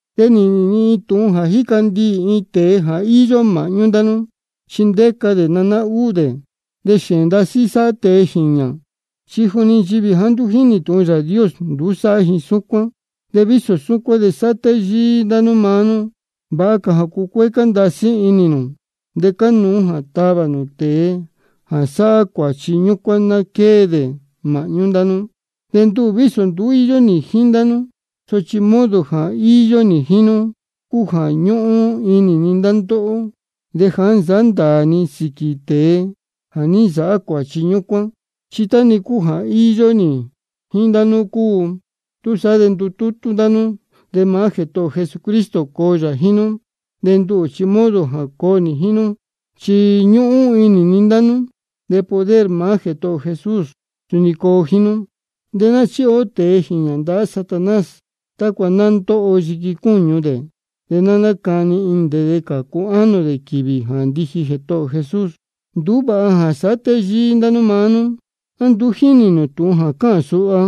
De nī nīhīn ni tūhun jā jíca ndiī iin tēe jā íyó māhñú ndá nú, chi ndéca dē naná úū dē. De xēēn ndasí sáhá tēe jīñā, chi juni nchivī jāá nduú jínī tūhun Yāā Dios, nduú sáhá ji súcuán. De vísō súcuán de sáhá téyíí ndá nú maá nú. Vāha cā jā cucuécá ndasí inī nū. De cánuú jā tavā nū tēe jā sáhá cuāchi ñúcuán ná quée dē māhñú ndá nú. De nduhū vísō nduú íyó nī jíín ndá nú, sochi modo jā íyó nī jíín nú cúu jā ñúhún inī ni ndá ndóhó. De ja nī nsāhá ndāā ni sīquī tēe jā ní nsāhá cuāchi ñúcuán, chi tá-ni cúu jā íyó nī jíín ndá nú cúu. Túsaá de ndutútú ndá nú, de maá Jētohō ō Jesucristo coo yā jíín nú. De nduhū chi modo jā coo nī jíín nú, chi ñúhún inī ni ndá nú. De poder maá Jētohō ō Jesús suni coo jíín nú. De ná chíhi ó tēe jīñā ndahá Satanás, tácua ná ndóho yiqui cúñu dē, de nacani inī dē de cācu ánō dē quīvī jā ndiji Jētohō ō Jesús. Nduú vāha jā sáhá téyíí ndá nú maá nú. ¿A nduú jínī nū tūhun jā cáhān suha?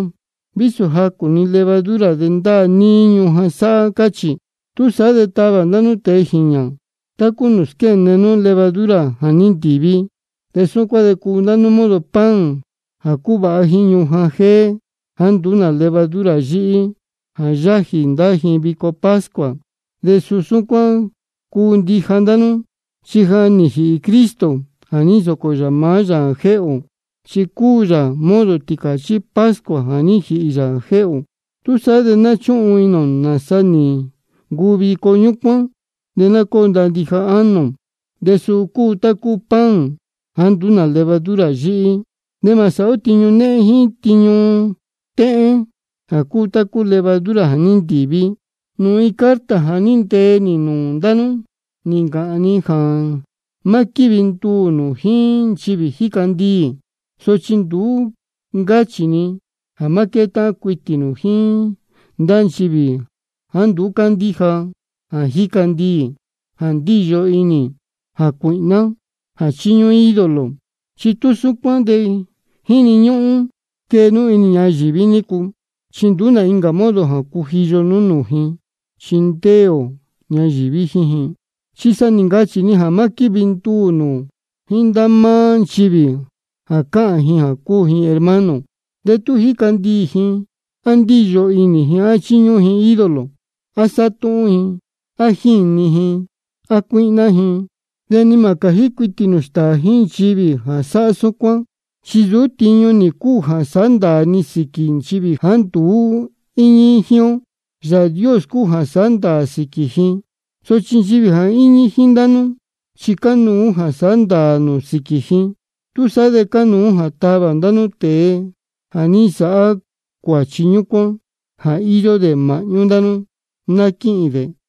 Vísō jacū-ni levadura de ndáā níí ñujan sáhá, cáchī. Túsaá de tavā ndá nú tēe jīñā tá cúu nūū squéne nú levadura jā ní ntīví. De súcuán de cuu ndá nú modo pan jā cúvāha jíín ñujan jéé jāá nduú nā levadura yíhí, jā yájī ndá ji vico pascua. De suu súcuán cúu ndija ndá nú. Chi ja nī jīhī Cristo jā ní nsōcō yā maá yā jēhē ō, chi cúu yā modo tīcāchí pascua jā ní jīhī jā jéhē ō. Túsaá de ná núcūhun inī ō nāsa nī ncuu vico ñúcuán, de ná cóo ndaā ndija ánō ō, de suu cúu tá cúu pan jāá nduú nā levadura yíhí. De mā sāhá ó tiñu néhén jíín tiñu téhén jā cúu tá cúu levadura jā ní ntīví. Nūū incā carta jā ní ntee nī nūū ndá nú nī ncāhān ni jā má quívi nduū nū jíín nchivī jíca ndiī. Sochi nduú ní ncáchī ni jā má quétáhán cuitī nū jíín ndá nchivī jāá nduú cándíja jā jíca ndiī, jā ndíyo inī, jā cuīhná, jā chíñúhún ídolo. Chi tú súcuán de jíni ñúhún quee nú inī ñayīví nícu, chi nduú nā incā modo jā cujiyo nú nūū ji chi ndéē ō ñayīví jíín ji. Chi sa nī ncachī ni jā má quívi nduū nū jíín ndá máá nchivī jā cáhān ji jā cúu ji hermano, de tú jíca ndiī ji, á ndíyo inī ji, á chíñúhún ji ídolo, á sátúhún ji, á jíni ji, á cuíhná ji. De ni mā cājí cuitī nū stāā jíín nchivī jā sáhá súcuán. Chi nsūú tiñu nī cúu jā sāhá ndāā ni sīquī nchivī jāá nduú íñí jíín ó. Yāā Dios cúu jā sāhá ndāā sīquī ji. Sochi nchivī jā íñí jíín ndá nú chi cánuú jā sāhá ndāā nū sīquī ji. Túsaá de cánuú jā tavā ndá nú tēe jā ní nsāhá cuāchi ñúcuán jā íyó dē māhñú ndá nú, ná quíhīn dē.